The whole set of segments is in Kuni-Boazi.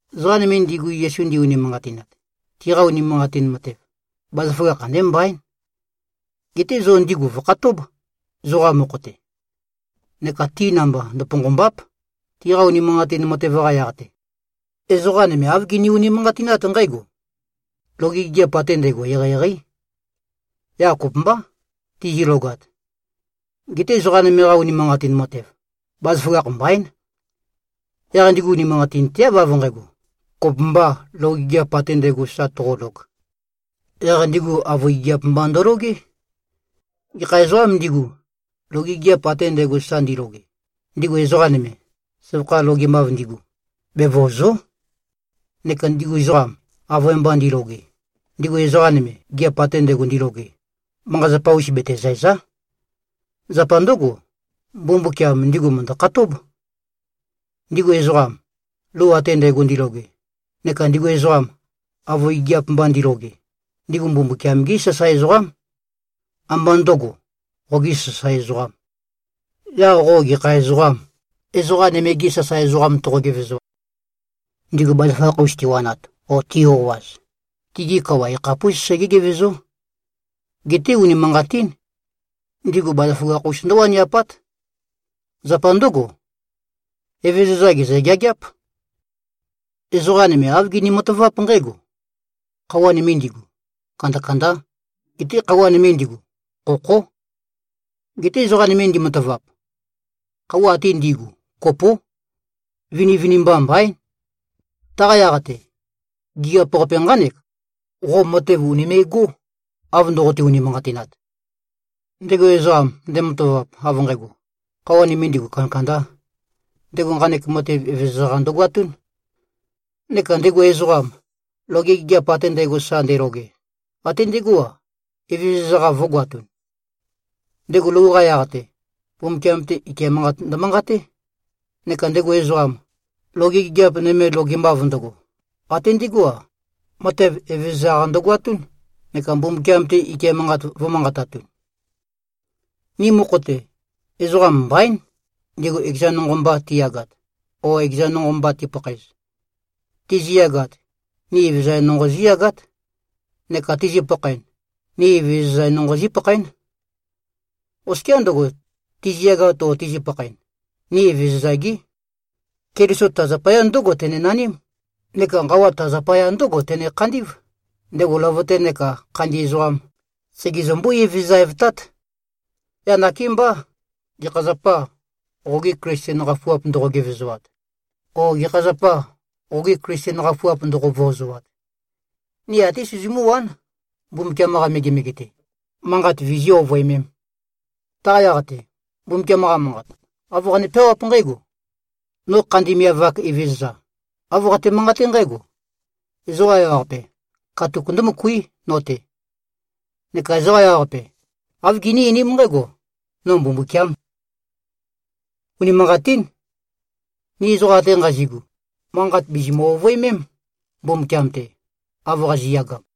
Ezoqa nøme ndigu Yesu ndi-unimanqatinat, tiqa unimanqatin matev, bazaføgakh andé mbaín. Geté zo ndigu vø̀khatób, zoqa mokho-te. Neka ti namba ndøponqòmba᷄p, tiqa unimanqatin matev-qa yaq-te. Ezoqa nøme āv gini-unimanqatinát nqǽgo: Loge gigiap ate ndægo eqeieqeí. Yaq kopømbá, tizilogat. Geté ezoqa nøme-qa unimanqatin matev, bazaføgakh mbaín. Yaq ndigu unimanqatinteáv av nqægo, kopømbā loge gigiap ate ndægo sa toqolog. Yaq ndigu avøe gigiap mba ndølogé. Gekha ezoqām ndigu, loge gigiap ate ndægo sa ndiloge, ndigu ezoqa nøme, søvakha logemav ndigu, bevøòzo᷄. Neka ndigu ezoqam, avøe mba ndiloge, ndigu ezoqa nøme, gigiap ate ndægo ndiloge, manqa-zapa-us betezæ̀za᷄. Zapa ndǿgo, Mbumbukiam ndigu mø̀ndø-khatób. Ndigu ezoqam, lou ate ndægo ndiloge, neka ndigu ezoqam, avøe gigiap mba ndiloge, ndigu Mbumbukiam-gí sasae ezoqám. Ambá ndø̄go, qogī sasae ezoqām. Yaq qo gekha ezoqâm, ezoqa nøme-gi sasae ezoqam toqo-gevezo? Ndigu bazaføgakh-us tiwanat o ti-o꞉az, tigi kawa yakhapús segé-gevezó. Geté, unimanqatín. Ndigu bazaføgakh-us ndǿwaniapát. Zapa ndǿgo, Evezøza gèzø-geageáp. Ezoqa nøme āv gini-mataváp nqǽgo: Khøuwa nøme ndigu, kandakandá, geté khøuwa nøme ndigu, khokhó. Geté ezoqa nøme ndimatavap. Khøuwa ate ndi꞉gu kopó. Vinivinimba mbaín. Taqa yaq-te, gigiap-qape nqánek: Qo matev ùnime꞉gó, av ndoqote-unimanqatinat. Ndego ezoqam, ndematavap av nqægo, khøuwa nøme ndigu, kandakandā, ndego nqanek matev Evezøza-qa ndøgoatún. Neka ndego ezoqam, loge gigiap ate ndægo sa ndeloge, até ndegó-a, Evezøza-qa vø̄goatun. Ndego lou-qa yaq-te, Mbumbukiam-te ike manqat ndømanqaté. Neka ndego ezoqam, loge gigiap nøme logemav ndøgo, até ndegó-a, matev Evezøza-qa ndøgoatún, neka Mbumbukiam-te ike manqat vø̄manqatatun. Ni mokho-te, ezoqam mbaín, ndigu ekezan nonqo mba tiyagat o ekezan nonqo mba tipakhaez. Tiziyagat, ni Evezøza nonqo zíyagát. Neka tizi-pakhaen, ni Evezøza nonqo zípakhaén. Oskiá ndøgo, tiziyagat o tizi-pakhaen, ni Evezøza-gí. Keliso ta zapaya ndǿgo tenenaním, neka nqawa ta zapaya ndǿgo tene-khandí꞉v, ndego løvøte nekā khandi ezoqam, segezømbú-Evezøza-evtát. Yaq nakémbá, gekha zapâ, qogi Klisten qafuap ndoqo-gevezoat? O gekha zapâ, qogi Klisten qafuap ndoqo-vøozoat? Ni até sizimú-wán, Mbumbukiam-qa megemege-te, manqat vizí-ovøemēm. Taqa yaq-te, Mbumbukiam-qa Manqat, āv qane-peawáp nqǽgo, “No khandi miav-ak Evezøza, āv qate-manqaté nqǽgo: Ezoqa ewaqape, katuk ndǿmøkuí no-te. Neka ezoqa ewaqape, āv giní-einím nqǽgo: No Mbumbukiām.” Unimanqatín. Ni ezoqa ate nqazi꞉gu, manqat bìzimø-ovøemém, Mbumbukiam-te, av qazi꞉yagam.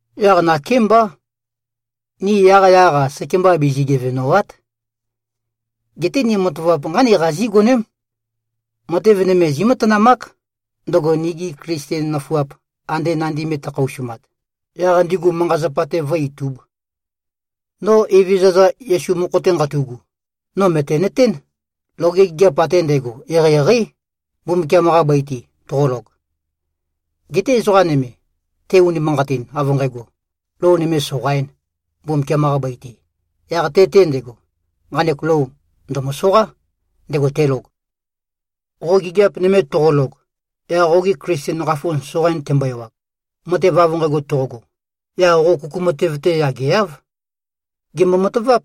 Yaq nakémbá, ni yaqyaq-a, sekemba bizi-gevèmba᷄m. Geté ni matavap nqánek qazí-goném: Matev nøme zímatanamák, ndøgo nigi Klisten nøfuap ande nandi me tøkhaosumat, yaq ndigu manqa-zapa-te vǿ-itūb. No Evezøza Yesu mokho-te nqatu꞉gu, no mø̀tenøtén, loge gigiap ate ndægo eqeieqeí, Mbumbukiam-qa bøi-te, toqolog. Geté ezoqa nøme, te-unimanqatin, av nqægo, lou nøme soqaīn Mbumbukiam-qa bøi-te, yaq te-te ndego, nqanek lou ndø̀møsoqá, ndego telog. Qo gigiap nøme toqolog, yaq qoge Klisten qafu soqain tembo-ewag; matev av nqægo toqogo, yaq qo kuku matev-te yageáv. Gèmbo-mataváp.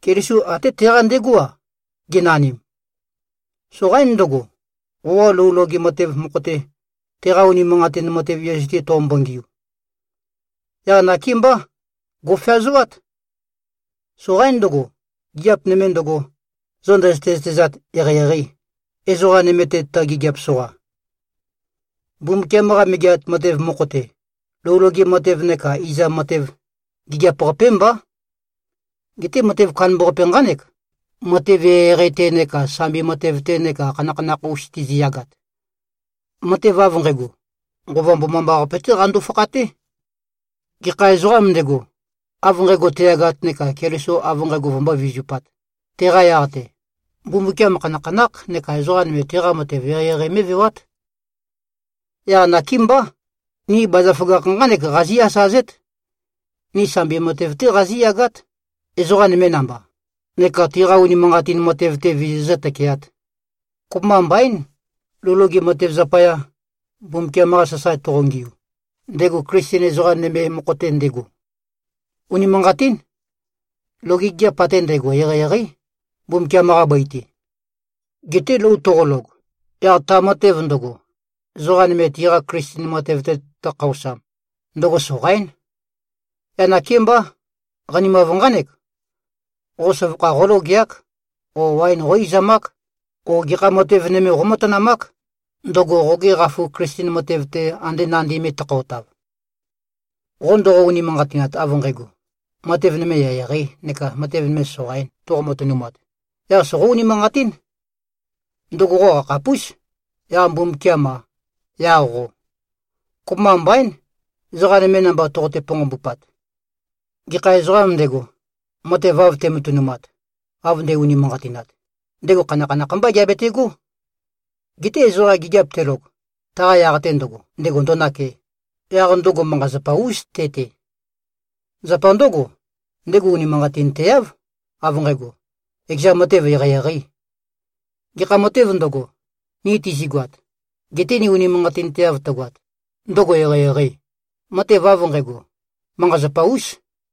Keliso até teqa ndegó-a, genanim. Soqaín ndøgo, qoqa lou loge matev mokho-te, teqa unimanqatin matev Yesu-te toqombo-ngiu. Yaq nakémbá, gò꞉feazoát. Soqaín ndøgo, gigiap nøme ndøgo, zo ndøzøte-zøtezat eqeieqeī, ezoqa nøme-te tø-gigiap-soqa. Mbumbukiam-qa Megeat Matev mokho-te, lou loge matev neka izam matev, gigiap-qapé mbá. Geté matev kandambaqape nqánek: Matev eqeieqei-te neka sambi matev-te neka khanakhanakh-us tiziyagat. Matev av nqægo, Nqova Mbomambaqape-té qando-fakhaté. Gekha ezoqām ndego, av nqægo teyagat neka Keliso av nqægo vømbó-vizupāt, teqa yaq-te, Mbumbukiam khanakhanákh neka ezoqa nøme teqa matev eqeieqei mé꞉vewát. Yaq nakémbá, ni bazaføgakh nqánek qazí-asazét: Ni sambi matev-té qazíyagát, ezoqa nøme namba, neka tiqa unimanqatin matev-te vizizǿ-tøkeāt. Kopømba mbaín, lou loge matev zapaya, Mbumbukiam-qa sasae toqongiu, ndego Klisten ezoqa nøme mokho-te ndego. Unimanqatín. Loge gigiap ate ndægo eqeieqeí, Mbumbukiam-qa bøi-te. Geté lou toqolog, yaq ta matev ndøgo, ezoqa nøme tiqa Klisten matev-te tøkhaosam, ndøgo soqaín. Yaq nakémbá, qanimav nqánek. Qo søvakha qólogeák o waen qó-izamák o gekha matev nøme qómatanamák, ndøgo qoge qafu Klisten matev-te, ande nandi me tøkhaotav. Qo ndoqo-unimanqatinat av nqægo, matev nøme eqeieqeī neka matev nøme soqaīn, toqo-matønumat, yaq soqó-unimanqatín. Ndøgo qo qakhapús, yaq Mbumbukiam-a, yaq qo. Kopømba mbaín, ezoqa nøme namba toqote-ponqombupat. Gekha ezoqām ndego, matev av te꞉matønumat, av nde꞉-unimanqatinat, ndego khanakhanakh mbá geabetegó. Geté ezoqa gigiap telog, taqa yaq-te ndøgo, ndego ndo꞉nake, yaq ndøgo manqa-zapa-ús te-te. Zapa ndǿgo, ndego unimanqatinteáv, av nqægo, ekeza matev eqeieqeī. Gekha matēv ndøgo, ni tizigoat, gete ni unimanqatinteav tøgoat, ndøgo eqeieqeī, matev av nqægo, manqa-zapa-ús.